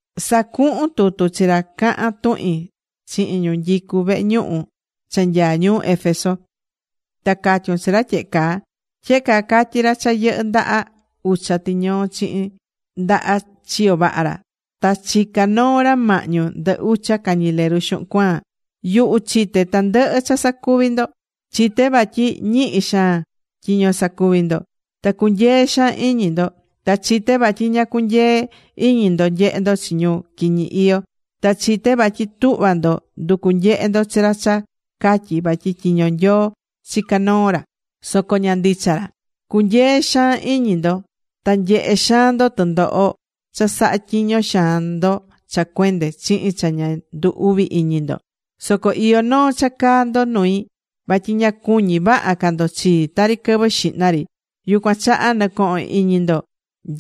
’Sa̱cuhun tutu chi ra cahán tuhin chihin ñu nyicú vehe ñuhu cha nyaá ñuu Éfeso. Ta ca̱tyun chi ra tyehe caa: “Tyehe caa catyí ra cha yɨhɨ́ ndaha ucha tiñoo chihin ndaha chiyo vaha ra. Ta chicá noo ra mahñu ndɨ ucha cañileru xuhun cuaan: Yuhu chité tandɨhɨ cha sacuví ndo. Chité vatyi ñihi xaan tyiño sacuví ndo. Ta cunyee xaan iñi ndo. Ta chité vatyi ña cunyeé iñi ndo nyehé ndo chi ñu quiñi iyó. Ta chité vatyi tuhva ndo nducu nyehe ndo chi ra cha catyí vatyi tyiño Nyoo chica noo ra soco ña ndicha ra. Cunyeé xaan iñi ndo. Ta nyehé xaan ndo tɨndoho ta cha sahá tyiño xaan ndo cha cuende chihin cha ña ndu uvi iñi ndo. Soco iyó noo cha caá ndo nui. Vatyi ña cuñí vaha ca ndo chii tari quɨvɨ xihna ri. Yucuan chaha nɨ̱cohon iñi ndo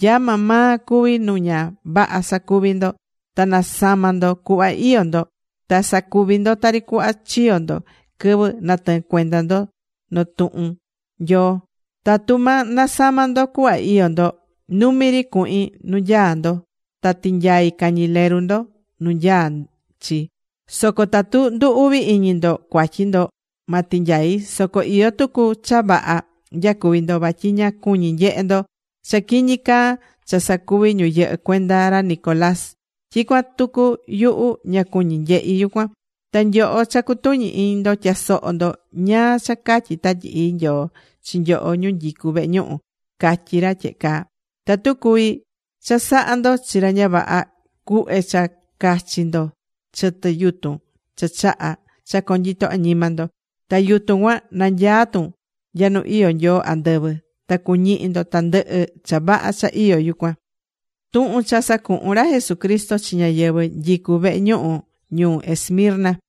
nya maa maa cuví nu ña vaha sacuvi̱ ndo. Ta na̱sama ndo cuhva iyó ndo. Ta sa̱cuvi ndo tari cuhva chiyo̱ ndo quɨvɨ natɨɨn cuenda ndo notuhun Nyoo. Tatu ma nasama ndo cuhva iyó ndo, numi ri cuhin nu nyaá ndo, ta tinyai cañileru ndo nu nyaá chi. Soco tatu ndu uvi iñi ndo cuatyi ndo, ma tinyai. Soco iyó tucu cha vaha nyacuví ndo. Vatyi ña cuñí nyehe ndo cha quiñi caa cha sacuví ñu yɨhɨ́ cuenda ra Nicolás. Tyicuan tucu yuhu ña cuñí nyehí yucuan. Ta nyoho cha cutuñi iñi ndo, tya̱soho ndo ñáá cha catyí Tatyi Ii Nyoo chi nyoho ñu nyicú vehe ñuhu. Catyí ra tyehe caa: Tatu cuví chasaha ndo chi ra ña vaha, cuhve cha cachi ndo chɨtɨ yutun cha chahá cha conyito añima ndo. Ta yutun cuan nanyaá tun nya nu iyó Nyoo andɨvɨ, ta cuñihi ndo tandɨhɨ cha vaha cha iyó yucuan.”Tuhun cha sacuhu̱n ra Jesucristo chi ñáyɨvɨ nyicú vehe ñuhu ñuu Esmirna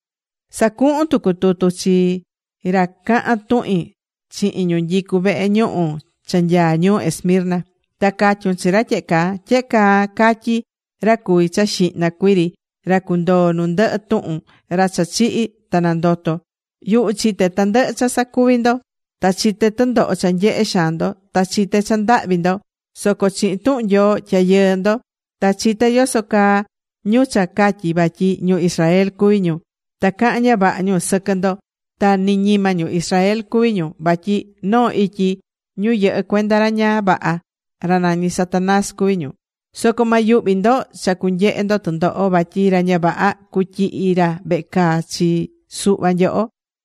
’Sa̱cuhun tucu tutu chi ra cahán tuhin chihin ñu nyicú vehe ñuhu cha nyaá ñuu Esmirna, ta ca̱tyun chi ra tyehe caa: “Tyehe caa catyí ra cuví cha xihna cuiri, ra cundoo nu ndɨhɨ tuhun, ra cha chihi̱ ta nandoto̱: Yuhu chité tandɨhɨ cha sacuví ndo. Ta chité tɨndoho cha nyehé xaan ndo. Ta chité cha ndahvi ndo. Soco chihin tuhun Nyoo, tyayɨɨ ndo. Ta chité yoso caa ñu cha catyí vatyi ñu Israel cuví ñu, ta cahán ña vaha ñu sɨquɨ ndo. Ta ni ñima ñu Israel cuví ñu vatyi noo ityi ñu yɨhɨ́ cuenda ra ña vaha, ra nañí Satanás, cuví ñu. Soco ma yuhvi ndo cha cunyehe ndo tɨndoho. Vatyi ra ña vaha cutyihi ra vehe caa chi suhva nyoho,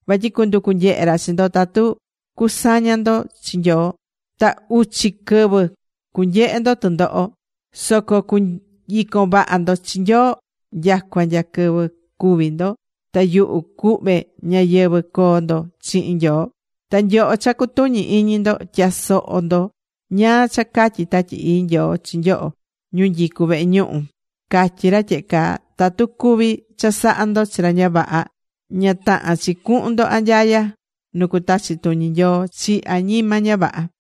vatyi cunducu nyehe ra chi ndo tatu cusaña ndo chi Nyoo. Ta uchi quɨvɨ cunyehe ndo tɨndoho. Soco cu̱nyicon vaha ndo chi Nyoo nyacua nya quɨvɨ cúvi ndo. Ta yuhu cuhve ñayɨvɨ̱ coo ndo chihin Nyoo. Ta nyoho cha cutuñí iñi ndo tya̱soho ndo ñáá cha catyí Tatyi Ii Nyoo chi nyoho ñu nyicú vehe ñuhu. Catyí ra tyehe caa: tatu cuví chasaha ndo chi ra ña vaha, ña tahán chi cuhun ndo anyaya, nu cutachi tuñi Nyoo chi añima ña vaha.”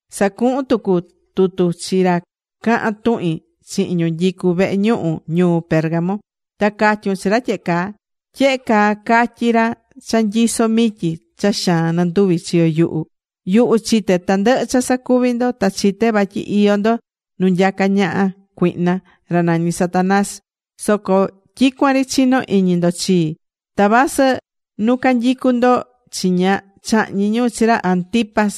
’Sa̱cuhun tucu tutu chi ra cahán tuhin chihin ñu nyicú vehe ñuhu ñuu Pérgamo. Ta ca̱tyun chi ra tyehe caa: “Tyehe caa catyí ra cha nyisó mityi cha xaan ndɨnduvi chiyo yuhu: Yuhu chité tandɨhɨ cha sacuví ndo. Ta chité vatyi iyó ndo nu nyacá ñaha cuihna, ra nañi Satanás. Soco tyicuan ri chinó iñi ndo chii. Ta vasɨ nu canyicú ndo chiña chahñi̱ ñu chi ra Antipas,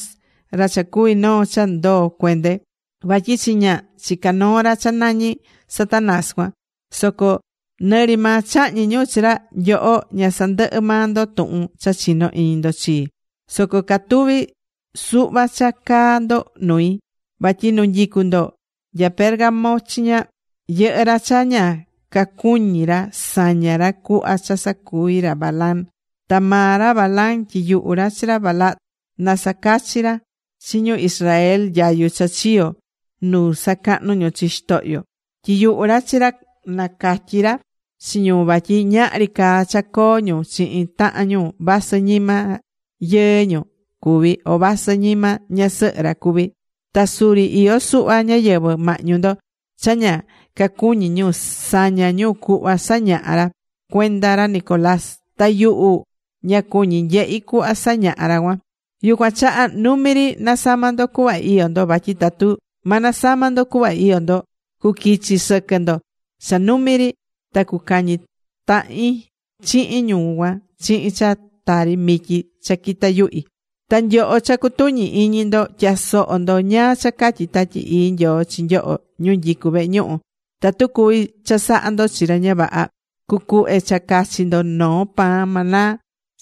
ra cha cuvi̱ noo cha ndoo cuende, vatyi chiña chicá noo ra cha nañí Satanás cuan. Soco nɨ ri maa chahñi̱ ñu chi ra, nyoho ña sandɨhɨ maa ndo tuhun cha chinó iñi ndo chii. Soco catuví suhva cha caá ndo nui: Vatyi nu nyicú ndo nya Pérgamo chiña, yɨhɨ́ ra cha ña cacuñí ra saña ra cuhva cha sacuvi̱ ra Balaam. Ta maa ra Balaam tyiyuhu̱ ra chi ra Balac, na sacachi ra chi ñu Israel nyayu cha chiyo̱ nu sacahnú ñu chi xitohyo. Tyiyuhu̱ ra chi ra nacatyi ra chi ñu vatyi ñahri caa cha coo ñu chihin tahan ñu vasɨ ñima yɨɨ ñu cuví, o vasɨ ñima ñasɨhɨ ra cuví. Ta suri iyó suhva ñáyɨvɨ mahñu ndo cha ña cacuñí ñu saña ñu cuhva sañahá ra cuenda ra Nicolás. Ta yuhu ña cuñí nyehi cuhva sañahá ra cuan. Yucuan chaha numi ri na̱sama ndo cuhva iyó ndo. Vatyi tatu ma nasama ndo cuhva iyó ndo, cuquichi sɨquɨ ndo cha numi ri ta cucañi tahin chihin ñu cuan chihin cha tari mityi cha quitá yuhi. Ta nyoho cha cutuñí iñi ndo, tya̱soho ndo ñáá cha catyí Tatyi Ii Nyoo chi nyoho ñu nyicú vehe ñuhu: tatu cuví chasaha ndo chi ra ña vaha, cucuhve cha cachi ndo noo pan maná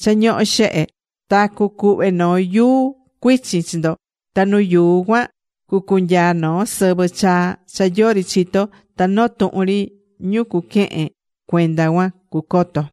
cha ñohó xehe. Ta cucuhve noo yuu cuichin chi ndo. Ta nu yuu cuan cucunyaa noo sɨvɨ chaa cha yori chitó. Ta noo tuhun ri ñu cuquehen cuenda cuan cucoto.”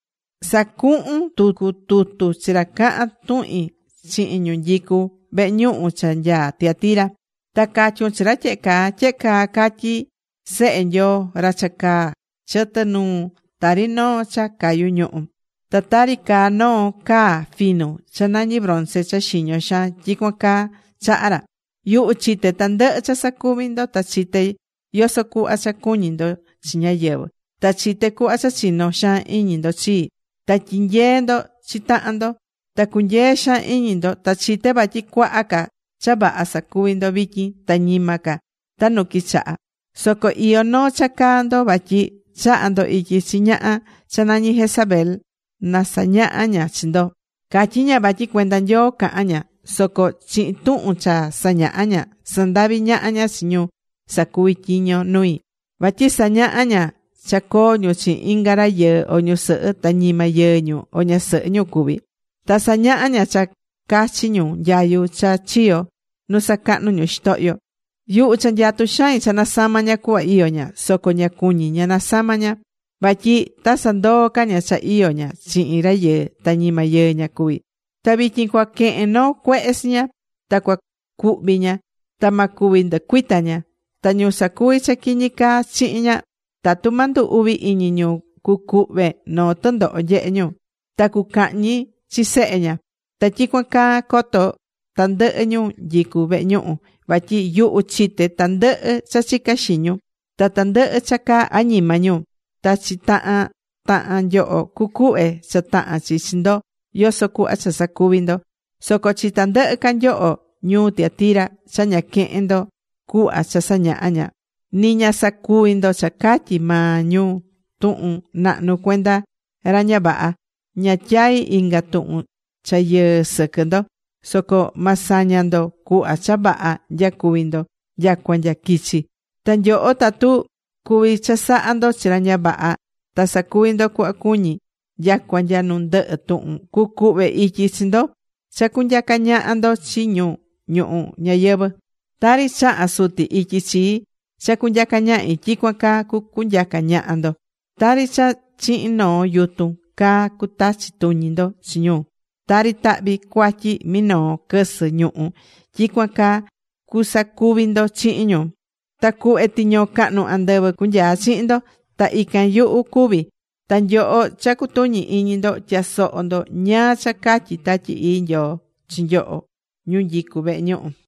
’Sa̱cuhun tucu tutu chi ra cahán tuhin chihin ñu nyicú vehe ñuhu cha nyaá Tiatira. Ta ca̱tyun chi ra tyehe caa: “Tyehe caa catyí Sehe Nyoo, ra cha caá chɨtɨ nuu tari noo cha cayú ñuhu. Ta tari caá noo caa finu cha nañí bronce cha xiño xaan, tyicuan caa chaha ra: Yuhu chité tandɨhɨ cha sacuví ndo. Ta chité yoso cuhva cha cuñí ndo chi ñáyɨvɨ. Ta chité cuhva cha chinó xaan iñi ndo chii. Ta tyinyeé ndo chi tahan ndo. Ta cunyee xaan iñi ndo. Ta chité vatyi cuaha ca cha vaha sacuví ndo vityin ta ñima ca ta nu quichaha. Soco iyó noo cha caá ndo: Vatyi chahá ndo ityi chi ñaha cha nañí Jezabel na sañaha ña chi ndo. Catyí ña vatyi cuenda Nyoo cahán ña. Soco chihin tuhun cha sañahá ña, sandaví ñaha ña chi ñu sacuví tyiño nui. Vatyi sañahá ña cha coo ñu chihin inga rayɨɨ o ñusɨhɨ ta ñima yɨɨ ñu o ñasɨhɨ ra cuví. Ta sañahá ña cha cachi ñu nyayu cha chiyo̱ nu sacahnu̱ ñu chi xitohyo. Yuhu cha nyatu̱ xain cha nasama ña cuhva iyó ña, soco ña cuñí ña nasama ña. Vatyi ta sandoo ca ña cha iyó ña chihin rayɨɨ ta ñima yɨɨ ña cuví. Ta vityin cua quehen noo cuehe chi ña. Ta cua cuhvi ña. Ta ma cuvi nducuita ña. Ta ñu sacuví cha quiñi caa chihin ña, tatu ma ndu uvi iñi ñu, cucuhve noo tɨndoho nyehe ñu. Ta cucahñi chi sehe ña. Ta tyicuan caa, coto tandɨhɨ ñu nyicú vehe ñuhu, vatyi yuhu chité tandɨhɨ cha chicá xiñi ñu, ta tandɨhɨ cha caá añima ñu. Ta chi tahan tahan nyoho cucuhve cha tahán chi chi ndo yoso cuhva cha sacuvi̱ ndo. Soco chi tandɨhɨ ca nyoho ñuu Tiatira, cha ña quehe̱n ndo cuhva cha sañahá ña, ni ña sacuví ndo cha catyí maa ñu tuhun nahnu cuenda ra ña vaha, ña tyaí inga tuhun cha yɨɨ sɨquɨ ndo. Soco ma saña ndo cuhva cha vaha nyacuví ndo nyacua nya quichi. Ta nyoho tatu cuví chasaha ndo chi ra ña vaha, ta sacuví ndo cuhva cuñí nyacua nya nu ndɨhɨ tuhun, cucuhve ityi chi ndo cha cunyaca ñaha ndo chi ñu ñuhu ñayɨvɨ̱. Tari chaha̱ Suti ityi chii cha cunyaca ñahi, tyicuan caa cucunyaca ñaha ndo. Tari cha chihin noo yutun caa cutachi tuñi ndo chi ñu. Tari tahvi cuatyi minoo quɨsɨ ñuhú, tyicuan caa cusacuvi ndo chihin ñu. Ta cuhve tiñoo cahnu andɨvɨ cunyaa chihin ndo. Ta ican yuhu cuví cuan. Ta nyoho cha cutuñí iñi ndo tya̱soho ndo ñáá cha catyí Tatyi Ii Nyoo chi nyoho, ñu nyicú vehe ñuhu.”